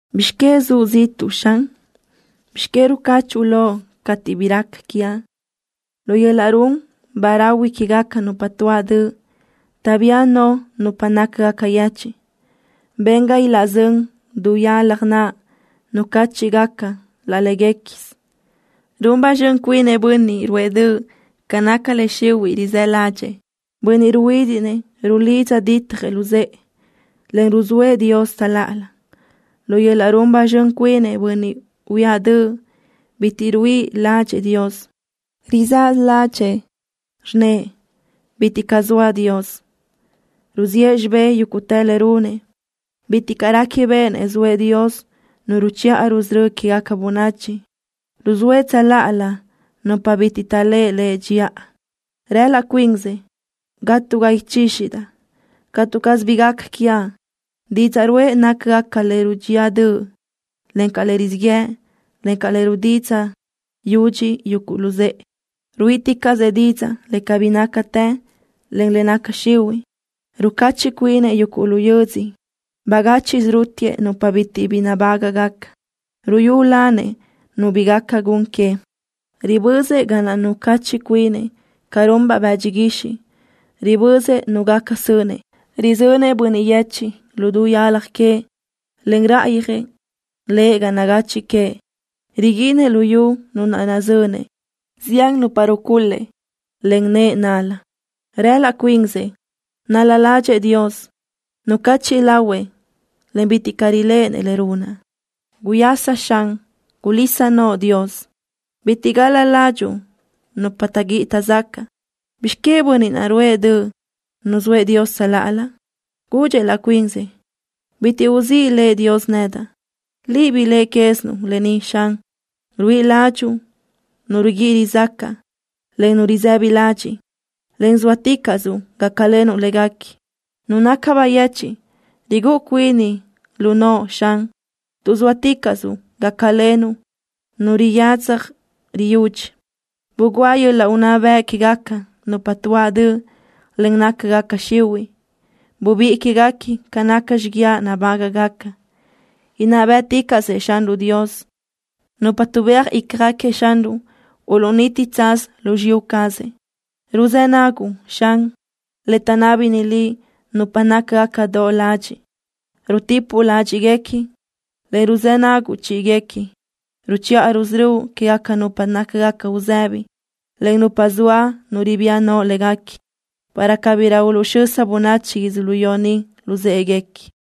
¿Bizx que zuʼ ziʼtuʼ, Xan? ¿Bizx que rucachiʼ loʼ cateʼ bi raca quiaʼ? Lu yöl-laʼ run ba rahui quégaca nupa tuáʼ döʼ taʼbía no nupa nácagaca yechiʼ. Ben ga ilaʼzö́n du yalaj naʼ nucáchiʼgaca laʼ léguequisö. Run ba zxön cuinëʼ bönniʼ ruʼë döʼ ca naca le xihuiʼ rizë́ ládxëʼë. Bönniʼ ruhuídiʼnëʼ rulidza ditjëʼ luzë́ʼë, en ruzóëʼ Dios tsöláʼalö. Lu yöl-laʼ run ba zxön cuinëʼ bönniʼ huíaʼ döʼ bitiʼ ruíʼi ládxëʼë Dios. Rizáʼasö ládxëʼë, rnnëʼ: Bitiʼ caʼ zoa Dios. Ruziʼë xibé yúguʼtë le runëʼ. Bitiʼ caʼ réquibeʼenëʼ zoëʼ Dios Nu ruchiʼa rusörö́ quégaca bönachi. Ruzóëʼ tsöláʼalö nupa bitiʼ taʼléʼe lëʼ dxiʼa. Rëʼ laʼ cuinsëʼ: “Gatga ichíxidaʼ. Catu caz bi gaca quiaʼ.” Didzaʼ ruʼë nácagaca le rudxía döʼ, encaʼ le rizíʼ yëʼ, en le rudidzaʼ yudxi yuguʼ luzë́ʼë. Ruíʼiticaʼsëʼ didzaʼ le cabí nácatë, en le naca xihuiʼ. Rucachiʼ cuinëʼ yuguʼ lu yödzö. Bagáchiʼsö rútiëʼ nupa bitiʼ bi nabágaʼgaca. Ruyúlanëʼ nu bi gaca gun que. Ribözëʼ ga naʼ nucachiʼ cuinëʼ ca runbaʼ bëdxi guixiʼ. Ribözëʼ nu gaca sönëʼ. Rizönëʼ bönniʼ yechiʼ lu du yalaj queëʼ, en ráʼayöjëʼ lëʼ ga nagachiʼ queëʼ. Riguinëʼ luyú nu naʼ nazönëʼ. Zián nupa rucul-lëʼ len nëʼë nal-la. Rëʼ laʼ cuinsëʼ: “Nal-la ládxëʼë Dios. Nucachiʼ lahuëʼ, en bitiʼ caʼ riléʼenëʼ le runaʼ.” ¡Guyasa, Xan! ¡Gulís noʼo, Dios! ¡Bitiʼ gal-la ládxuʼu nupa taʼguíʼi taʼzacaʼ! ¿Bizx que bönniʼ naʼ ruʼë döʼ nuzóëʼ Dios tsöláʼalö? Gudxëʼ laʼ cuinsëʼ: Bitiʼ uzíʼ lëʼ Dios nedaʼ. Liʼ biléʼe quézinuʼ lë ni, Xan. Ruíʼi ládxuʼu nu riguíʼi rizácaʼ, en nu risëbi ladxiʼ, en zóaticaʼsuʼ gácalenuʼ léguequi. Nu naca bayechiʼ rigúʼu cuini lu noʼo, Xan, tuʼ zóaticaʼsuʼ gácalenuʼ nu riyadza riyudxi. Bugúa yöl-laʼ unná bëʼ quégaca nupa tuáʼ döʼ, en nácagaca xihuiʼ. Bubíʼi quéguequi ca naca xiguiaʼ nabágaʼgaca. Inná bë́ʼticaʼsëʼ Xanruʼ Dios. Nupa tuʼbéaj ícjaguequi Xanruʼ uluʼniti tsaz lu xiyú cazëʼ. Ruzë́ naguʼ, Xan, le taʼnábini Liʼ nupa nácagaca doʼ ladxiʼ. Rutipuʼ ládxiʼguequi, en ruzë́ naguʼ chíʼiguequi. Ruchiʼa rusörö́uʼ quégaca nupa nácagaca uzëbi, en nupa zoa nu ribía no léguequi, para cabirö uluʼxösa bönachi yödzölió ni luzë́ʼeguequi.